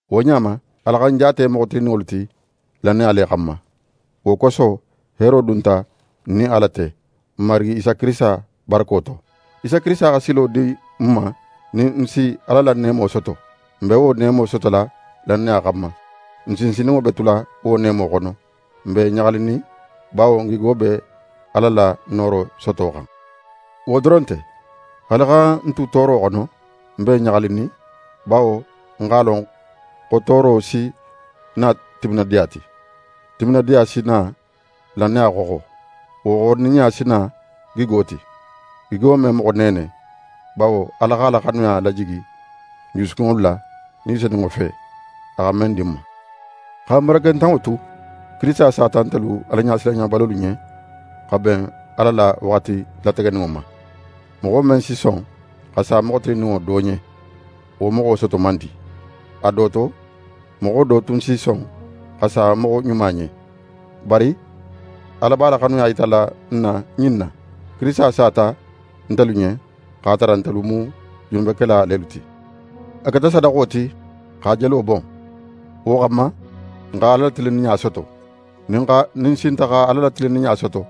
Wo ɲa ma, Ala xa n jaate moxo tilinninŋolu ti lannaya le xanma. Wo koso, heero dunta n nin Ala te, n Marigi Isa Kirisita barako to. Isa Kirisita xa silo di n ma nin n si Ala la neemo soto. N be wo neemo sotola lannaya xanma. N sinsinninŋo be tula wo neemo xono. N be ɲaxalinin, bawo n gigo be Ala la nooro soto xan. Wo doron nte, haali xa n tu tooro xono, n be ɲaxalinin, bawo n x'a lon xo tooro si na timinadiya ti. Timinadiya si n na lannaya xoxo. Wo xoxoninɲa si na gigo ti. Gigo me moxo neene; bawo Ala x'a la xanuya lajigi n jusukunŋolu la Ni Senunŋo fe, a xa men di n ma. Xa n barakentanŋo tu, Kirisita sata ntelu Alaɲasilanɲabalolu ɲen, xa ben Ala la waxati lategeninŋo ma. Moxo men si son xa sa moxo tilinninŋo do ɲen, wo moxo soto man di. A do to, moxo do tun si son xa sa moxo ɲuma ɲen. Bari Ala b'a la xanuya yitala n na ɲin na: Kirisita sata ntelu ɲen, x'a tara ntelu mu junubekela lelu ti. A keta sadaxo ti x'a jelo bon. Wo xanma, n xa Ala la tilinninɲa soto. Nin n sinta xa Ala la tilinninɲa soto,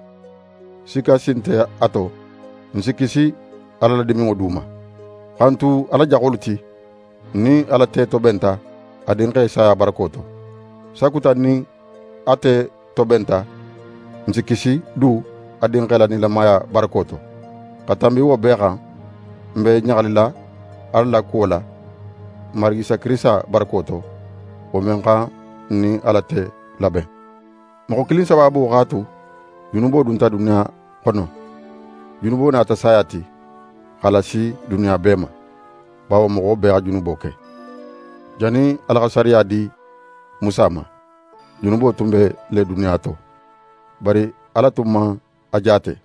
sikka si nte a to, n si kisi Ala la diminŋo du ma. Xa n tu Ala jaxolu ti, n nin Ala te tobenta a Dinxe saya barako to. Sakuta n nin a te tobenta, n si kisi du a Dinxe la nilamaya barako to. Xa tanbi wo bee xan, n be ɲaxalila Ala la kuwo la n Marigi Isa Kirisita barako to, wo men xa n nin Ala te laben. Moxo kilin sabaabo x'a tu junubo dunta duniya xono. Junubo nata saya ti, x'a lasi duniya bee ma; bawo moxo bee xa junubo ke. Jannin Ala xa sariya di Musa ma, junubo tun be le duniya to. Bari Ala tun man a jaate,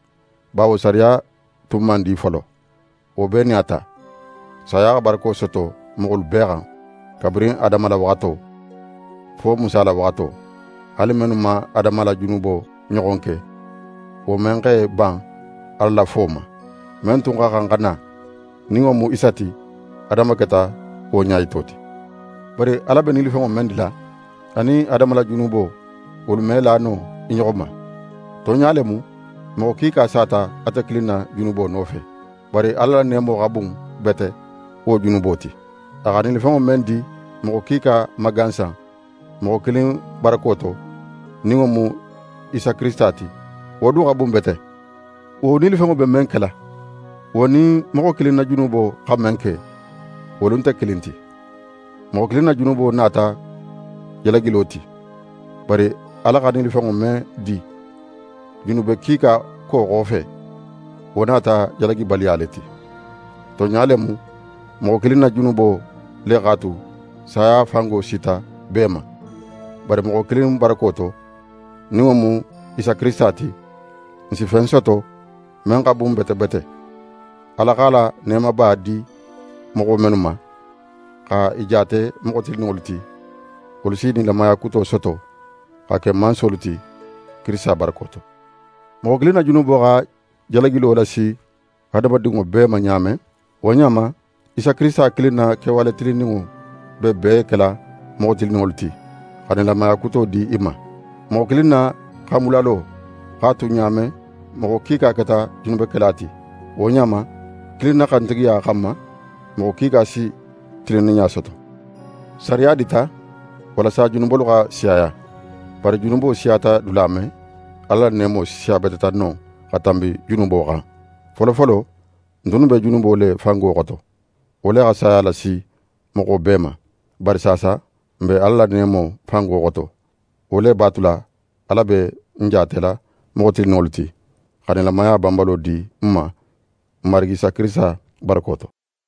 bawo sariya tun man di folo. Wo bee nin a ta, saya xa barako soto moxolu bee xan, kabirin Adama la waxato, fo Musa la waxato; haali mennu man Adama la junubo ɲoxon ke, wo men x'é ban Ala la fo ma. Men tun xa xan xa na, nin wo mu Isa ti, Adama keta wo ɲayito ti. Bari Ala be nilifenŋo men dila, anin Adama la junubo, wolu me la no i ɲoxo ma. Tonɲa le mu, moxo kiika sata ate kilin na junubo nofe. Bari Ala la neemo xa bun bete wo junubo ti. A xa nilifenŋo men di moxo kiika ma gansan moxo kilin barako to, nin wo mu Isa Kirisita ti, wo du xa bun bete. Wo nilifenŋo be men kela, wo nin moxo kilin na junubo xa men ke, wolu nte kilin ti: Moxo kilin na junubo nata jalagilo ti; bari Ala xa nilifenŋo men di junube kiika ko xofe, wo nata jalagibaliya le ti. Tonɲa le mu, moxo kilin na junubo le x'a tu saya fango sita bee ma. Bari moxo kilin barako to, nin wo mu Isa Kirisita ti, n si fen soto men xa bun bete bete: Ala x'a la neemaba di moxo mennu ma, xa i jaate moxo tilinninŋolu ti, wolu si nilamaya kuto soto xa ke mansolu ti Kirisita barako to. Moxo kilin na junubo xa jalagilo lasi hadamadinŋo bee ma ɲa men, wo ɲa ma, Isa Kirisita kilin na kewale tilinninŋo be bee kela moxo tilinninŋolu ti, xa nilamaya kuto di i ma. Moxo kilin na xanbulalo x'a tu ɲa men moxo kiika keta junubekela ti, wo ɲa ma, kilin na xantigiya xanma, moxo kiika si tilinninɲa soto. Sariya dita walasa junubolu xa siyaya; bari junubo siyata dula men, Ala la neemo siyabeteta non xa tanbi junubo xan. Folofolo, n tunnu be junubo le fango xoto; wo le xa saya lasi moxo bee ma. Bari saasa, n be Ala la neemo fango xoto; wo le b'a tula Ala be n jaatela moxo tilinninŋolu ti, xa nilamaya banbalo di n ma n Marigi Isa Kirisita barako to.